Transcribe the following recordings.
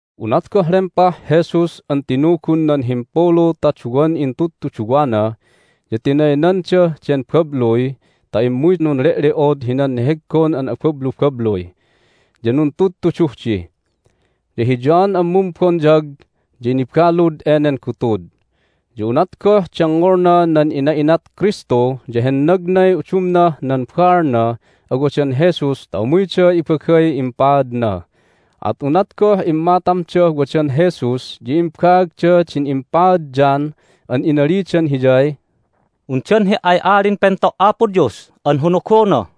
Unat goh lempah Jesus an tinugun nan himpulu ta duwan intudtuduwana ya tinaynandah den babluy ta immuy nunle'le'od hinan neheggon an abablubabluy, ya nuntudtuduh di. Ya hi John an Mumbonyag ya nibalud enen gutud. Ya unat goh dengngolna nan ina'inat Kristu ya hennagnay udumnah nan baalnah awadan Jesus ta umuyda ibagay impaadna. At unat goh immatamdah wadan Jesus ya imbaagda din impaad John an inalidan Hiyay, "Undan He"ay Alin Pento' Apo Dios an honogona,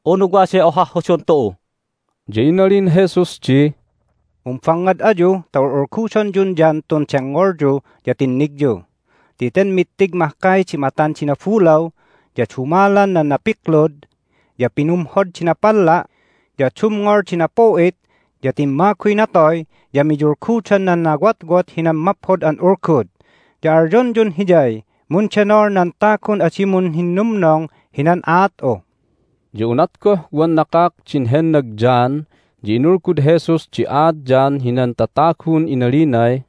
unu waday ohah hodon tu'u?" Ya inalin Jesus di, "Mumbangngad ayu ta ul'ulgudonyun John tun dengngolyu ya tinnigyu. Ti ten mittig mahkay di matan di nabulaw, ya dumalan nan napiklud, ya pinumhod di napalla', ya dumngol di napu'it, ya timmaguy natoy, ya miyulgudan nan nawotwot hinan Maphod an Ulgud. Ya alyonyun hiyay, Mundenol nan tagun adi munhinnumnong hinan aat'u!" Ya unat goh wan nakak din hennag John ya inulgud Jesus di aat John hinan tatagun inalinay,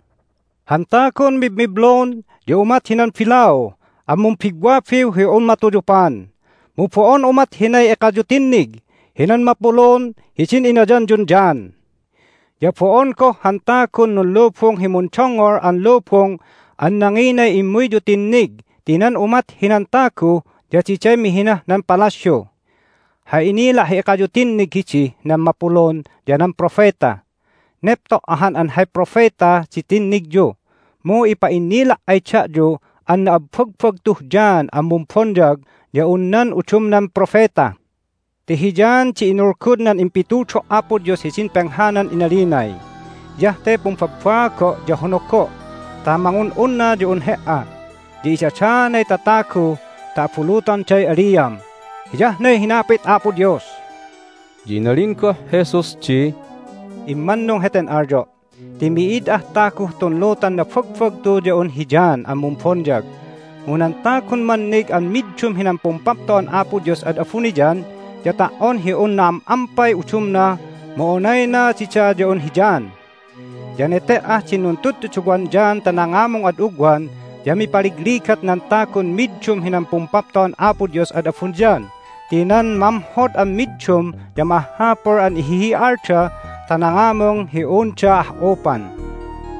"Han tagun mibmiblun ya umat hinan bilau an mumbigwabiw hi un matuyupan, mu bo'on umat hinay ekayu tinnig hinan mapulun hidin inayanyun John. Ya bo'on goh han tagun nunlubung hi mundongngol an lubung an nanginay immuyyu tinnig ti nan umat hinan tagu ya diday mihinah nan palasyu! Hay inila' hi ekayu tinnig hidih nan mapulun ya nan propeta. Nepto' ahan an hay propeta di tinnigyu, mu ipa'innila' ay da'yu an na'abbagbagtuh John an Mumbonyag ya un nan udumnan propeta. Ti hi John di inulgud nan impitudo' Apo Dios hidin penghanan inalinay, Hiyah te pumbabbaago', ya honago' ta mangun'unna ya un He"a. Ya idadaanay tatagu ta abulutonday aliam. Hiyah ne hinapit Apo Dios." Ya inalin goh Jesus di, "Immannung heten alyo' ti mi'id ah taguh tun lutan nabagbagtu ya un hi John an Mumbonyag. Mu nan tagun mannig an middum hinan Pumpapto'an Apo Dios ad abuniyan ya ta"on hi un na'am'ampay udumna mu onayna dida ya un hi John. Ya nete"ah din nuntuduwan John ta nangamung ad ugwan ya mipaligligat nan tagun middum hinan Pumpapto'an Apo Dios ad abuniyan ti nan mamhod an middum ya ma'ahhapul an ihihi'alda ta nangamung hi unda ah'upan.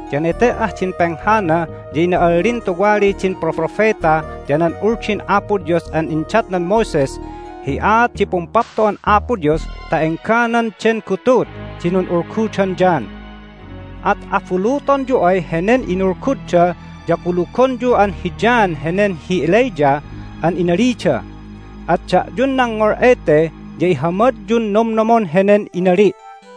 Ya nete"ah din penghana ya ina'allin tuwali din Propropeta ya nan Uldin Apo Dios an indatnan Moses hi aat di Pumpapto'an Apo Dios ta engganan den gutud di nun'ulgudan John. At abulutonyu ay henen inulgudda ya kulugonyu an hi John henen hi Elijah an inalida. At da'yun nangngol ete ya ihamadyun nomnomon henen inali'!"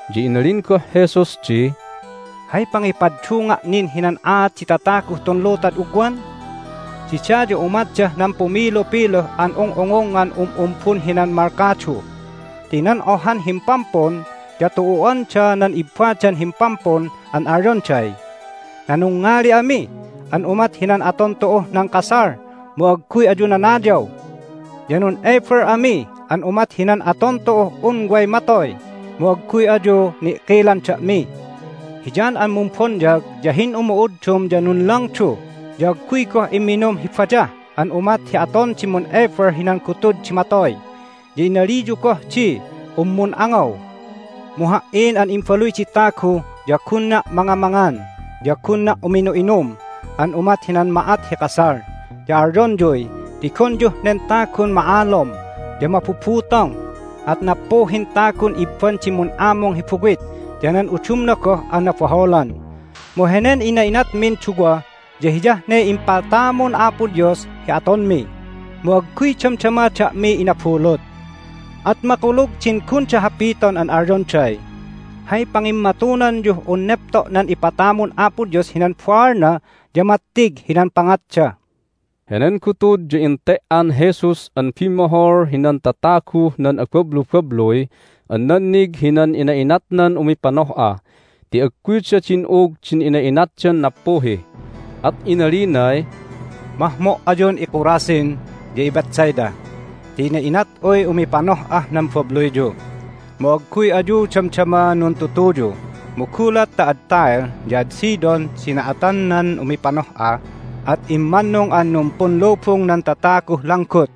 Ya inalin goh Jesus di, "Hay pangipaddunga' nin hinan aat di tataguh tun lutad ugwan? Dida ya umatdah nan pumilupiluh an ung'ungungngan um'umbun hinan malkadu! Ti nan ohan himpampun ya tu'u'anda nan ibbadan himpampun an alyonday, Nanungngali ami an umat hinan aton tu'uh nan kasal, mu agguy ayu nanayaw! Ya nun'ebel ami an umat hinan aton tu'uh un way matoy, mu agguy ayu ni'kilan da'mi! Hi John an Mumbonyag ya hin'umu'uddum ya nunlangdu ya agguy goh imminum hi bayah an umat hi aton di mun'ebel hinan gutud di matoy, ya inaliyu goh di un mun'angaw! Mu Ha"in an Imbaluy di Tagu ya gunna' mangamangan, ya gunna' uminu'inum an umat hinan ma'at hi kasal, ya alyonyuy, Tigonyuh nen tagun ma'alom ya mabubutong, at nappuhin tagun ibban di mun'amung hi buwit ya nan udumna goh an nabaholan! Mu henen ina'inatmin duwa ya hiyah ne impatamun Apo Dios hi atonmi, mu agguy damdama da'mi inabulut. At makulug din gunda hapiton an alyonday, Hay pangimmatunanyuh un nepto' nan ipatamun Apo Dios hinan baalna ya mattig hinan pangatda." Henen gutud ya ente"an Jesus an bimmohol hinan tataguh nan abablubabluy an nannig hinan ina'inatnan umipanoh'a ti agguyda din'ug din ina'inatdan nappuhi. At inalinay, "Mahmo' ayun iKorazin ya iBethsaida! Ti ina'inat'uy umipanoh'ah nan babluyyu, mu agguy ayu damdama nuntutuyu! Mu gulat ta ad Tyre ya ad Sidon di na'atan nan umipanoh'a at immannung an numpunlubung nan tataguh langgut,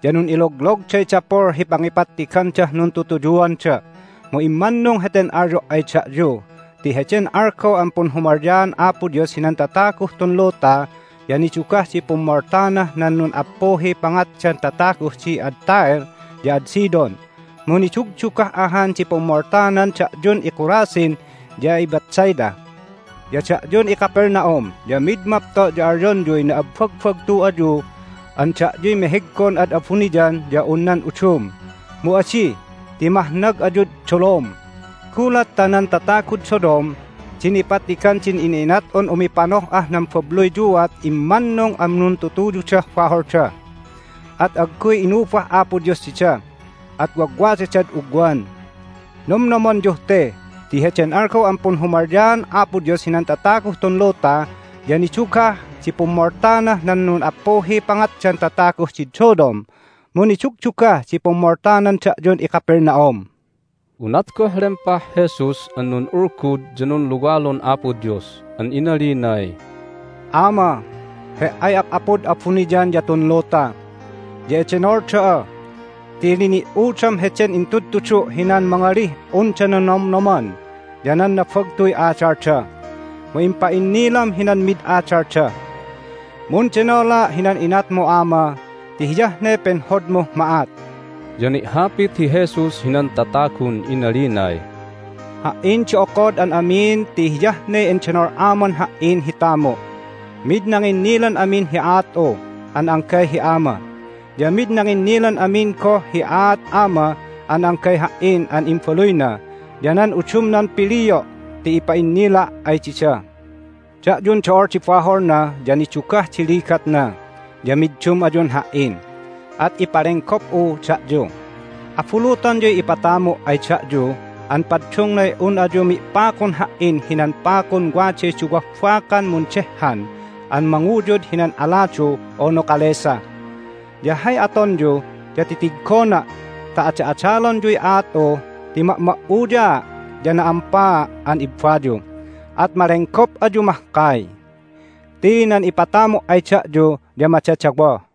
ya nun'iloglogday dapul hi pangipattigandah nuntutuyuanda! Mu immannung heten alyo' ay da'yu ti heden algaw an punhumalyaan Apo Dios hinan tataguh tun luta ya nidugah di pummoltanah nan nun'appuhiy pangatdan tataguh di ad Tyre ya ad Sidon, mu nidugdugah ahan di pummoltanan da'yun iKorazin ya iBethsaida. Ya da'yun iCapernaum ya mid mapto' ya alyonyuy na'abbagbagtu ayu an da'yuy meheggon ad abuniyan ya un nan udum! Mu adi, ti mahnag ayud dolom! Gulat ta nan tatagud Sodom di nipattigan din ina'inat'un umipanoh'ah nan babluyyuat immannung an nuntutuyudah baholda, at agguy inubah Apo Dios dida, at wagwadadad ugwan! Nomnomonyuh te ti heden algaw an punhumalyaan Apo Dios hinan tataguh tun luta ya nidugah di pummoltanah nan nun'appuhiy pangatdan tataguh did Sodom, mu nidugdugah di pummoltanan da'yun iCapernaum!" Unat goh lempah Jesus an nun'ulgud ya nunluwalun Apo Dios an inalinay, "Ama, He"ay Ap'apud abuniyan ya tun luta, ya edenol da'a ti lini"udam heden intudtudu' hinan mangalih unda nanomnoman ya nan nabagtuy adalda, mu impa'innilam hinan mid adalda. Mundenola' hinan inatmu, Ama, ti hiyah ne penhodmuh ma'at." Ya ni'hapit hi Jesus hinan tatagun inalinay, "Ha"in di okod an amin ti hiyah ne endenol Aman Ha"in hi tamu'. Mid nanginnilan amin hi aat'u an anggay hi Ama. Ya mid nanginnilan amin goh hi aat Ama an anggay Ha"in an Imbaluyna ya nan udumnan pilio' ti ipa'innila' ay dida. Da'yun do'ol di baholna ya nidugah di ligatna ya middum ayun Ha"in, at ipalenggop'u da'yu! Abulutonyuy ipatamu' ay da'yu an paddungnay un ayu mi'pakun Ha"in hinan pakun waday duwah bakan mundehhan an manguyud hinan aladu unu kalesa. Ya hay atonyu ya titiggona' ta ada'adalonyuy aat'u ti ma'ma'uyaa' ya na'ampaa' an ibbayu, at malenggop ayu mahkay. Ti nan ipatamu' ay da'yu ya madadawoh."